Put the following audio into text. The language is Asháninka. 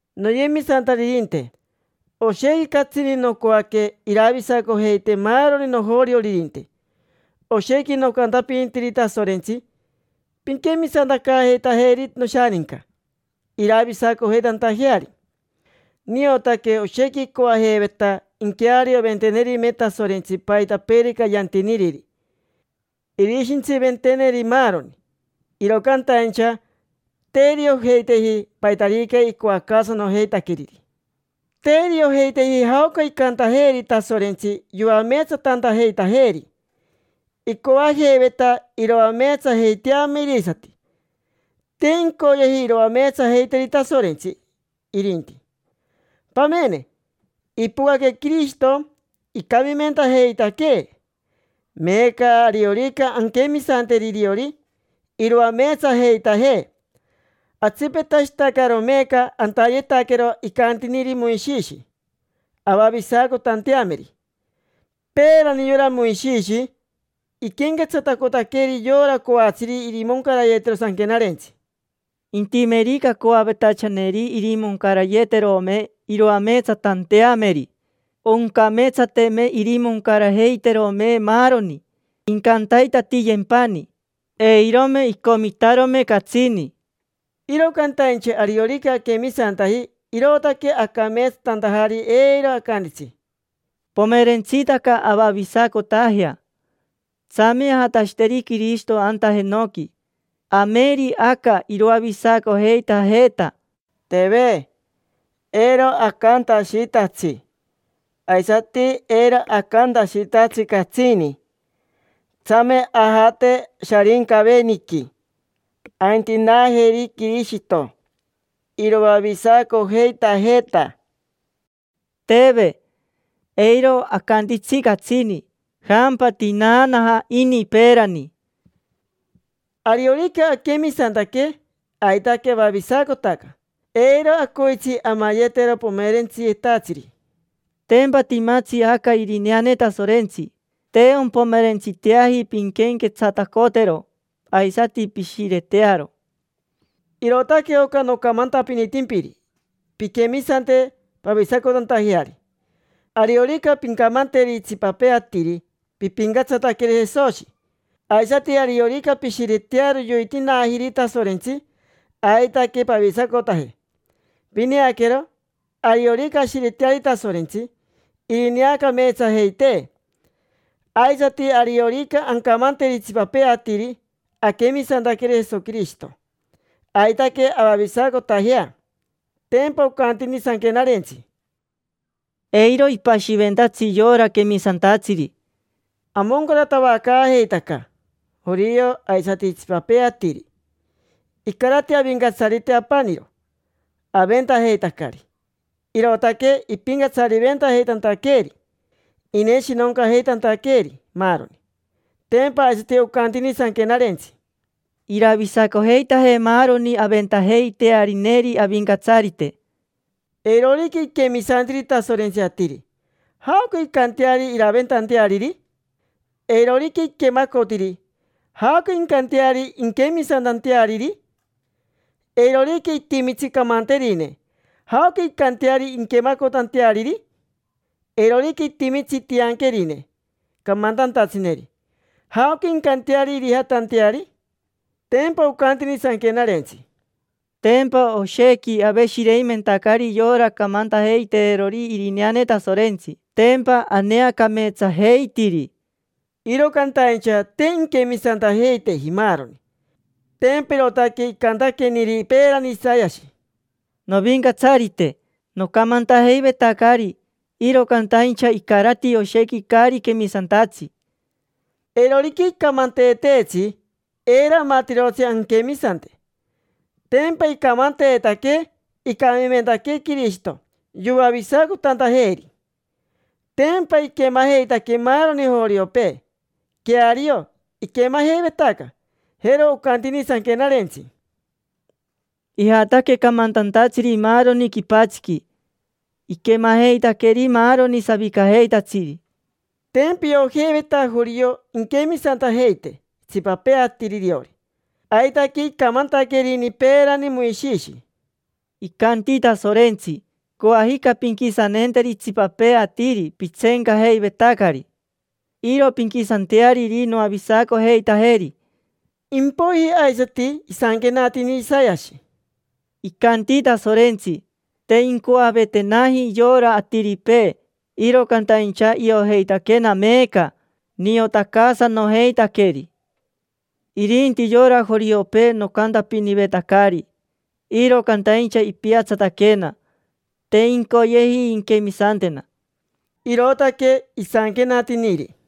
Noyemisantaririnte, oshequi catsini nocoaque iravisacojeite maaroni nojorioririnte, oshequi nocantapinitiri Tasorentsi: “Pinquemisantacaajeitajeri noshaninca, iravisacojeitantajeari”. Niotaque oshequi icoajeiveta inquearioventenerime Tasorentsi paitapeerica yantiniriri, irishintsiventeneri maaroni. Iro cantaincha te iriojeiteji paitarica icoacaasanojeitaqueriri. Te iriojeiteji jaoca icantajeeri Tasorentsi yoameetsatantajeitajeeri. Icoajeiveta iroameetsajeiteame irisati, te incoyeji iroameetsajeiteri Tasorentsi, irinti. Pamene, ipocaque Quirishito, icamimentajeitaquee. Meeca, ariorica anquemisanteri iriori, iroameetsajeitajee. Atsipetashitacaro meeca antayetaquero icantiniri Moishishi avavisacotanteameri. Peerani yora Moishishi iquenquetsatacotaqueri yora coatsiri irimoncarayetero Sanquenarentsi: “Intimerica coavetachaneri irimoncarayeterome iroameetsatanteameri, oncameetsateme irimoncarajeiterome maaroni, incantaitatiyempani. Eirome icomitarome catsini”. Iro cantaincha ariorica aquemisantaji irootaque acameetsatantajari, eiro acantitsi: “Pomerentsitaca avavisacotajea. Tsame ajatashiteri Quirishito anta jenoqui, ameri aca iroavisacojeitajeeta”. Teve, eiro acantashitatsi; aisati eiro acantashitatsi catsini: “Tsame ajate Sharincaveniqui, aintinaajeri Quirishito, iroavisacojeitajeeta”. Teve, eiro acantitsi catsini. Jampa tinaanaja ini peerani. Ariorica aquemisantaque, aitaque avavisacotaca: eiro acoitsi amayetero pomerentsiyetatsiri. Tempa timatsi aca irineane Tasorentsi: te ompomerentsiteaji pinquenquetsatacotero aisati pishiretearo. Irootaque oca nocamantapinitimpiri: pinquemisante pavisacotantajeari. Ariorica pincamanteri itsipapee atiri pipincatsataqueri Jesoshi, aisati ariorica pishiretearo yoitinaajiri Tasorentsi, aitaque pavisacotaje. Pineaquero, ariorica ashireteari Tasorentsi, irineacameetsajeitee; aisati ariorica ancamanteri itsipapee atiri aquemisantaqueri Jesoquirishito, aitaque avavisacotajea. Tempa ocantini Sanquenarentsi: “Eiro ipashiventatsi yora quemisantatsiri”. Amoncaratavacaajeitaca: jorio aisati itsipapee atiri. Icarati Avincatsarite apaniro. Aventajeitacari, irootaque ipincatsariventajeitantaqueeri, ineshinoncajeitantaqueeri maaroni. Tempa aisati ocantini Sanquenarentsi: “Iravisacojeitaje maaroni aventajeitearineri Avincatsarite”. Eirorica iquemisantiri Tasorentsi atiri, ¿jaoca incanteari iraventanteariri? Eirorica iquemacotiri, ¿jaoca incanteari inquemisantanteariri? Eirorica itimitsi camanterine, ¿jaoca incanteari inquemacotanteariri? Eirorica itimitsi tianquerine camantantatsineri, ¿jaoca incanteari irijatanteari? Tempa ocantini Sanquenarentsi: “Tempa oshequi aveshireimentacari yora camantajeiteerori irineane Tasorentsi, tempa aneacameetsajeitiri”. Iro cantaincha te inquemisantajeiteji maaroni. Tempa irootaque icantaqueniri peerani Isayashi: “Novincatsarite, nocamantajeivetacari, iro cantaincha icarati oshequi caari quemisantatsi”. Eirorica icamanteeteetsi, eiro amatirotsi anquemisante. Tempa icamanteetaquee icamimentaquee Quirishito, yoavisacotantajeeri. Tempa iquemajeitaque maaroni joriopee. Queario, iquemajeivetaca. Jero ocantini Sanquenarentsi: “Ijataque camantantatsiri maaroni quipatsiqui, iquemajeitaqueri maaroni savicajeitatsiri”. Tempa iojeiveta jorio inquemisantajeite itsipapee atiri iriori. Aitaque icamantaquerini peerani Moishishi: “Icanti Tasorentsi: ‘Coajica pinquisaneenteri itsipapee atiri pitseencajeivetacari. Iro pinquisanteariri noavisacojeitajeri’”. Impoiji aisati isanquenatini Isayashi: “Icanti Tasorentsi: ‘Te incoavetenaji yora atiripee, iro cantaincha iojeitaquena meeca: niotacaasanojeitaqueri. Irinti yora joriopee nocantapinivetacari, iro cantaincha ipiatsataquena, te incoyeji inquemisantena’”. Irootaque isanquenatiniri.